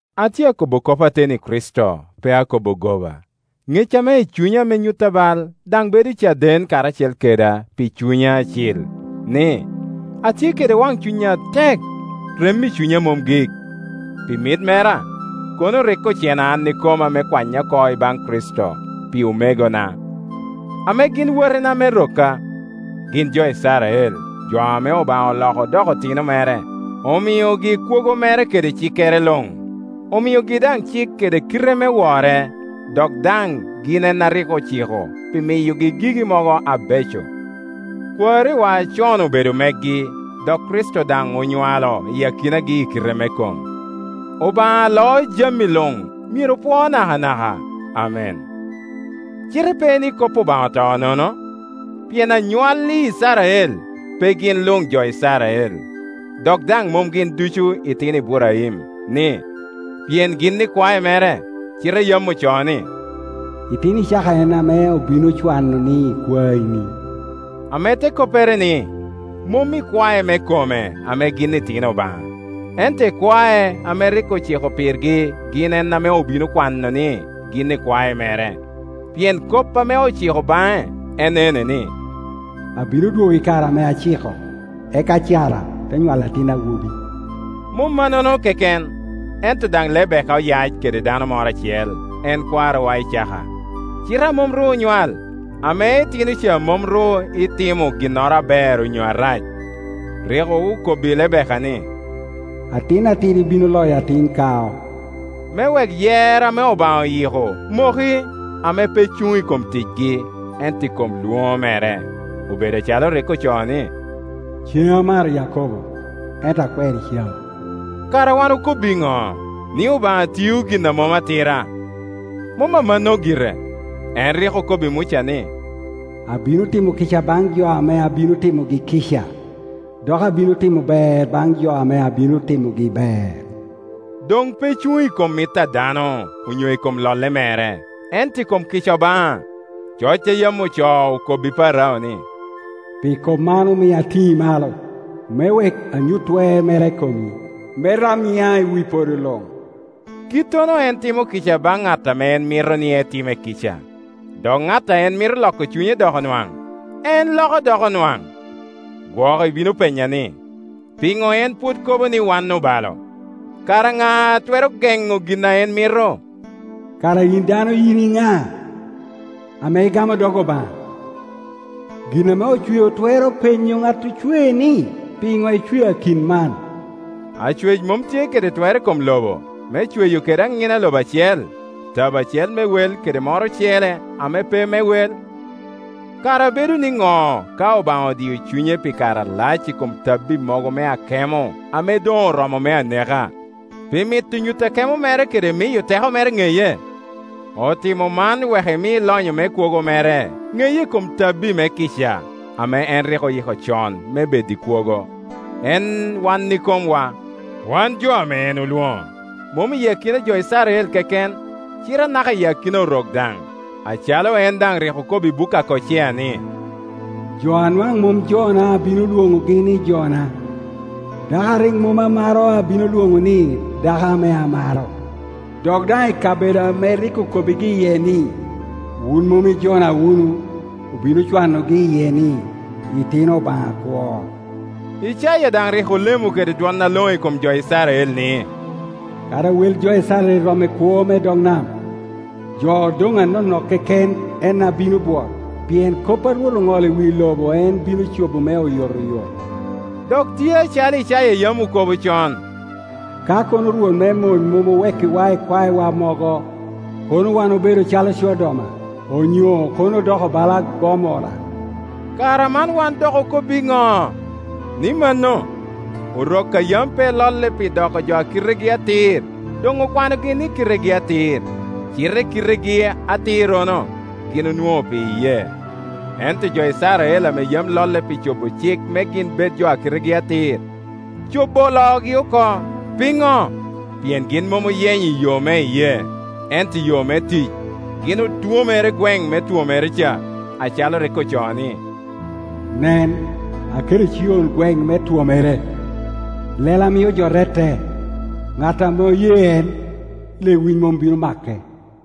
Atye akobbo kop ateni i Kricito, pe akobo goba; ŋec ame i cunya ame nyutta bal daŋ bedo caden karacel keda pi Cunya Acil, ni, atye kede waŋcuny atek, rem i cunya mom gik. Pi mit mera, kono rik ocena an ikoma me kwanya oko ibaŋ Kricito, pi omegona, ame gin watina me rokka. Gin jo Icrael, jo ame Obaŋa oloko odoko otino mere, omiogi kwogo mere kede cikere luŋ, omiogi daŋ cik kede kite me wore, dok daŋ gin en a rik ociko pi miyogi gigi mogo abeco. Kwariwa acon obedo megi, dok Kricito daŋ onywalo i akinagi i kite me kom. Obaŋa aloo jami luŋmyero opwoo nakanaka. Amen. Cite pe ni kop Obaŋa oto nono; pien anywalli Icrael pe gin luŋjo Icrael, dok daŋ mom gin ducu itino Iburaim, ni, pien gin ikwae mere; cite yam ocoo ni, “Itino Icaka en ame obino cwano ni ikwaeni.” Ame te koppere ni, mom ikwae me kome ame gin itino Obaŋa, ento ikwae ame rik ociko pirgi gin en ame obino kwano ni gin ikwae mere. Pien kop ame ociko baŋe en ene, ni, “Abino dwogo i kare ame aciko, eka Cara te nywalo atin awobi.” Mom mannono keken, ento daŋ Lebeka oyac kede dano moro acel, en kwarowa Icaka, cite a mom ru onywal, ame itino ca mom ru itimo ginnoro aber onyo arac, rik okobbi Lebeka ni, “Atin atidi bino loyo atin kao,” me wek yer ame Obaŋa oyiko moki, ame pe cuŋ i kom ticgi, ento i kom lwoŋo mere. Obedo acalo rik ocoo ni, “Ceŋ amaro Yakobo, ento akwero Ecau.” Kara wan dok okob iŋo? Ni Obaŋa tiyo gin a mom atira? Mom amanno gire. En rik okobbi Muca ni, “Abino timo kica baŋ jo ame abino timogi kica, dok abino timo ber baŋ jo ame abino timogi ber.” Doŋ pe cuŋ i kom mit a dano, onyo i kom lolle mere, ento i kom kica Obaŋa. Coc a yam ocoo okobbi Parao ni, “Pi kop man omio atini malo, me wek anyut twer mera i komi, me rab nyiŋa i wi podo luŋ.” Kittono en timo kica baŋ ŋat a en mito ni etime kica, dok ŋat a en mito loko cunye doko nwaŋ, en loko doko nwaŋ. Gwok ibino penya ni, “Piŋo en pwod kobo ni wan obalo? Kara ŋa a twero geŋo gin a en mito?” Kara yin dano yin iŋa, ame igamo dog Obaŋa? Gin ame ocweo twero penyo ŋat ocwee ni, “Pi ŋo icwea kit man?” Acwec mom tye kede twer i kom lobo, me cweyo kede aŋina lobo acel, tabo acel me wel kede moro ocele ame pe me wel? Kara bedo ni ŋo ka Obaŋa odio cunye pi kare alac i kom tabbi mogo me akemo ame doŋ oromo me aneka, pi mito nyuto akemo mere kede miyo teko mere ŋeye? Otimo man wek emi lonyo me kwogo mere ŋeye i kom tabbi me kica, ame en rik oyiko con me bed i kwogo, en wan ikomwa, wan jo ame en olwoŋo, mom i akina a jo Icrael keken, cite anaka iyi akina Orok daŋ. Acalo en daŋ rik okobo i buk a Kocea, ni, “Jo a nwaŋ mom jona abino lwoŋogi ni ‘jona’, dako a rik mom amaro abino lwoŋo ni, ‘dako ame amaro.’” “Dok daŋ i kabedo ame rik okobbigi iye ni, ‘Wun mom i jona wunu’, obino cwanogi iye ni, ‘itino Obaŋa akwo.’” Icaya daŋ rik olemo kede dwoŋ aloŋo i kom jo Icrael ni, “Kadi wel jo Icrael rom i kwoo me dog nam, jo odoŋ anonok keken en a bino bwot; pien kop a Rwot oŋolo i wi lobo en bino cobo me oyotoyot” Dok tye acalo kaya yam okobo con, “Ka kono Rwot me mony mom owekkiwa ikwaewa mogo, kono wan obedo calo Codoma, onyo kono odoko bala Gomorra.” Kara man wan dok okob iŋo? Ni mano, Orok a yam pe lolle pi doko jo a kitegi atir doŋ okwanogi ni kitegi atir, cite kitegi atirrono gin onwoŋo pi iyee. Ento jo Icrael ame yam lolle pi cobo cik me gin bed jo a kitegi atir, cobo oloogi oko. Piŋo? Pien gin mom oyenyo i yo me iyee, ento i yo me tic. Gin otwomere i gweŋ me twomere ca, acalo rik ocoo ni, “Nen, aketo i Cion gweŋ me twomere, lela a mio jo rette; ŋat ame oye en, lewic mom bino make.”